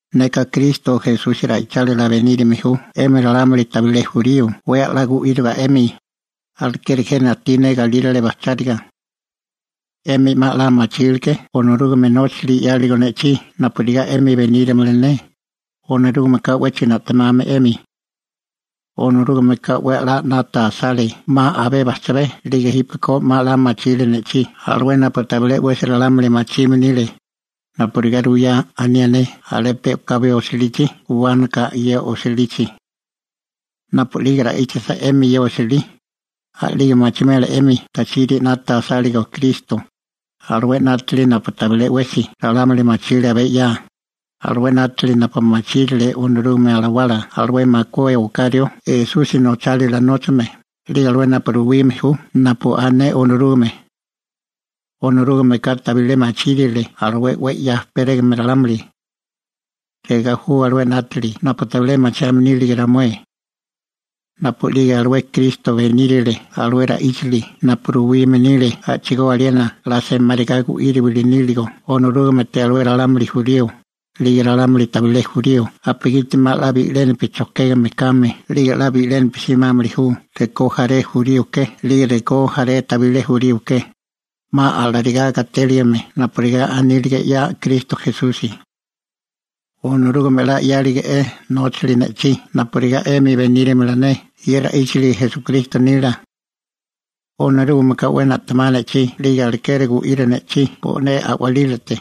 Neka Kristo Esusi ra'ichálila benírime ju 'emi ralámuli tabilé jurío 'we a'lá gu'íriga 'emi, alekeri jena ajtí ne galírale bajcháriga. 'Emi 'ma 'la machíleké Onorúgame nóchali 'yáligo ne'chí napurigá 'emi benírimala ne, Onorúgameka 'wéchigo na'temame 'emi. Onorúgameka 'we 'la 'nata asale 'ma abé bajchabé 'lige jípeko 'ma 'la machiri ne'chí alué napu tabilé 'wesi ralámuli machime nile, napurigá ruyá anié ne alé pe u'kabi osilichi guwánaka ye osilichi. Napu'lige ra'íchisa 'emi ye osilí, a'lige machimela 'emi tachiri 'nata asáligo Kristo, alué 'nátili napu tabilé 'wesi ralámuli machile abé 'ya, alué 'nátili napu machírile Onorúgame Alawala alué makué oká rió Esusi nochálila nóchame 'lige alué napu ruwime ju napu ané Onorúgame. Onorúgameka tabilé machírile alué 'we 'ya ejperégame ralámuli. Regá ju alué 'nátili napu tabilé machiame nírige ramué: napu'lige alué Kristo benírale alué ra'íchali napu ruwime nile a'chigó aliena 'la semáriga gu'íriwili níligo Onorúgamete alué ralámuli jurío 'lige ralámuli tabilé jurío napugiti 'ma 'la bi'lénapi chojkégame kame 'lige 'la bi'lénapi simámili ju rekó jaré jurío ke 'lige rekó jaré tabilé jurío ke, 'ma alarigá gatéligime napurigá anílige 'ya Kristo Esusi. Onorúgame 'la 'yálige'é nóchali ne'chí napurigá 'emi benírimala ne ye ra'íchali Esukristo nila. Onorúgameka 'we na'temá ne'chí 'lige alekeri gu'iri ne'chí bo'né a'walílate.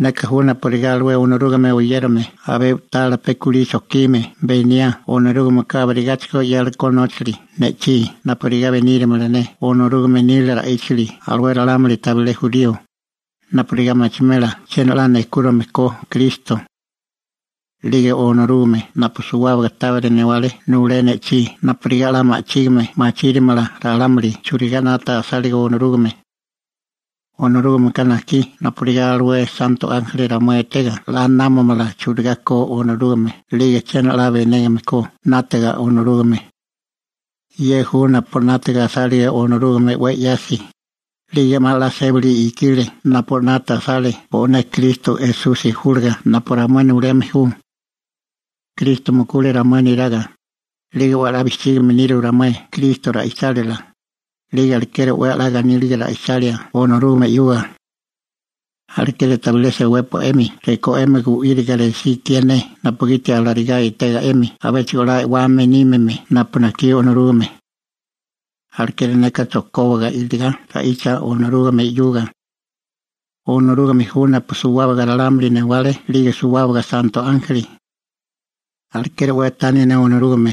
Neka ju napurigá alué Onorúgame oyérame abé u'tala pe kulí chojkime beniá Onorúgameka abirigáchigo 'yáleko nóchali ne'chí napurigá benírimala ne Onorúgame nila ra'íchali alué ralámuli tabilé jurío, napurigá machimela chiena 'la nejkúrime ko Kristo. 'Lige Onorúgame napu suwábaga tábiri newale nulé ne'chí napurigá 'la ma'chígime machírimala ralámuli churigá 'nata asáligo Onorúgame. Onorúgameka najkí napurigá alué santo ánjeli ramué etega 'la námamala churigá ko Onorúgame 'lige chiena 'la benégame ko 'nátaga Onorúgame. Ye ju napu 'nata asálige Onorúgame 'we 'yasi, 'lige 'ma 'la sébali ikile napu 'nata asale bo'né Kristo Esusi júliga napu ramué nuleme ju. Kristo mukule ramué neraga, 'lige 'we 'la bijchígame niru ramué Kristo ra'ichálila, 'lige alekeri 'we 'la ganíliga ra'ichalia Onorúgame 'yuga. Alekeri tabilé sewépua 'emi rekó 'emi gu'íriga resí ikié ne napugiti alarigá etega 'emi abéchigo 'la e'wame nímime napu najkí Onorúgame. Alekeri neka chojkóbaka iligá ra'icha O'nó Onorúgame 'yuga. Onorúgame ju napu suwábaga ralámuli newale 'lige suwábaga santo ánjeli. Alekeri 'we tani ne Onorúgame,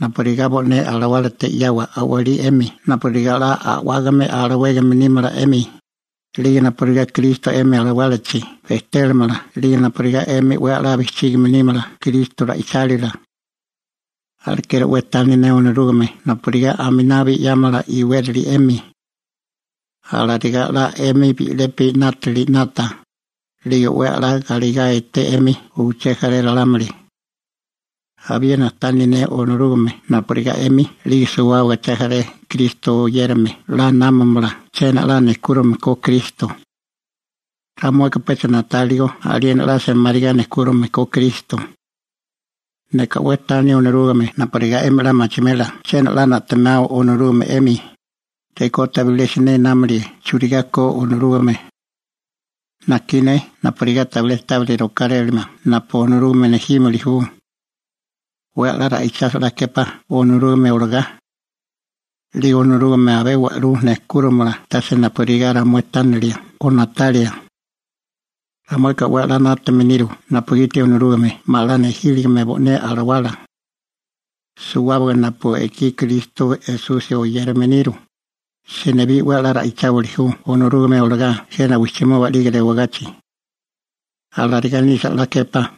napurigá bo'né alawálate 'yawa a'walí 'emi napurigá 'la a'wágame alawégame nímala 'emi, 'lige napurigá Kristo 'emi alawálachi bejtélamala 'lige napurigá 'emi 'we 'la bijchígime nímala Kristo ra'ichálila. Alekeri 'we tani ne Onorúgame napurigá aminabi 'yámala iwérali 'emi. Alarigá 'la 'emi bi'lepi 'nátili 'nata, 'lige 'we 'la galegá eté 'emi uché jaré ralámuli. Abiena tani ne Onorúgame napurigá 'emi 'lige suwábaga uché jaré Kristo oyérame 'la námamala chiena 'la nejkúrame ko Kristo. Ramueka pecha na'táliko aliena 'la semáriga nejkúrime ko Kristo. Neka 'we tani Onorúgame napurigá 'emi 'la machimela chiena a'lá na'temao Onorúgame 'emi, rekó tabilé siné námalie churigá ko Onorúgame. Najkí ne napurigá tabilé tabiri rokárélamala napu Onorúgame nejímili ju. 'We 'la ra'ichasa 'la képá Onorúgame olagá. 'Lige Onorúgame abé wa'lú nejkúromala tase napurigá ramué tánilia o na'talia. Ramueka 'we 'la 'nátame niru napugiti Onorúgame 'ma 'la nejíligime bo'né Alawala. Suwábaga napu ekí Kristo Esusi oyérame niru, senibí 'we 'la ra'icháwili ju Onorúgame olagá jena wijchimoba 'lige rewagachi. Alarigá nisa 'la képá.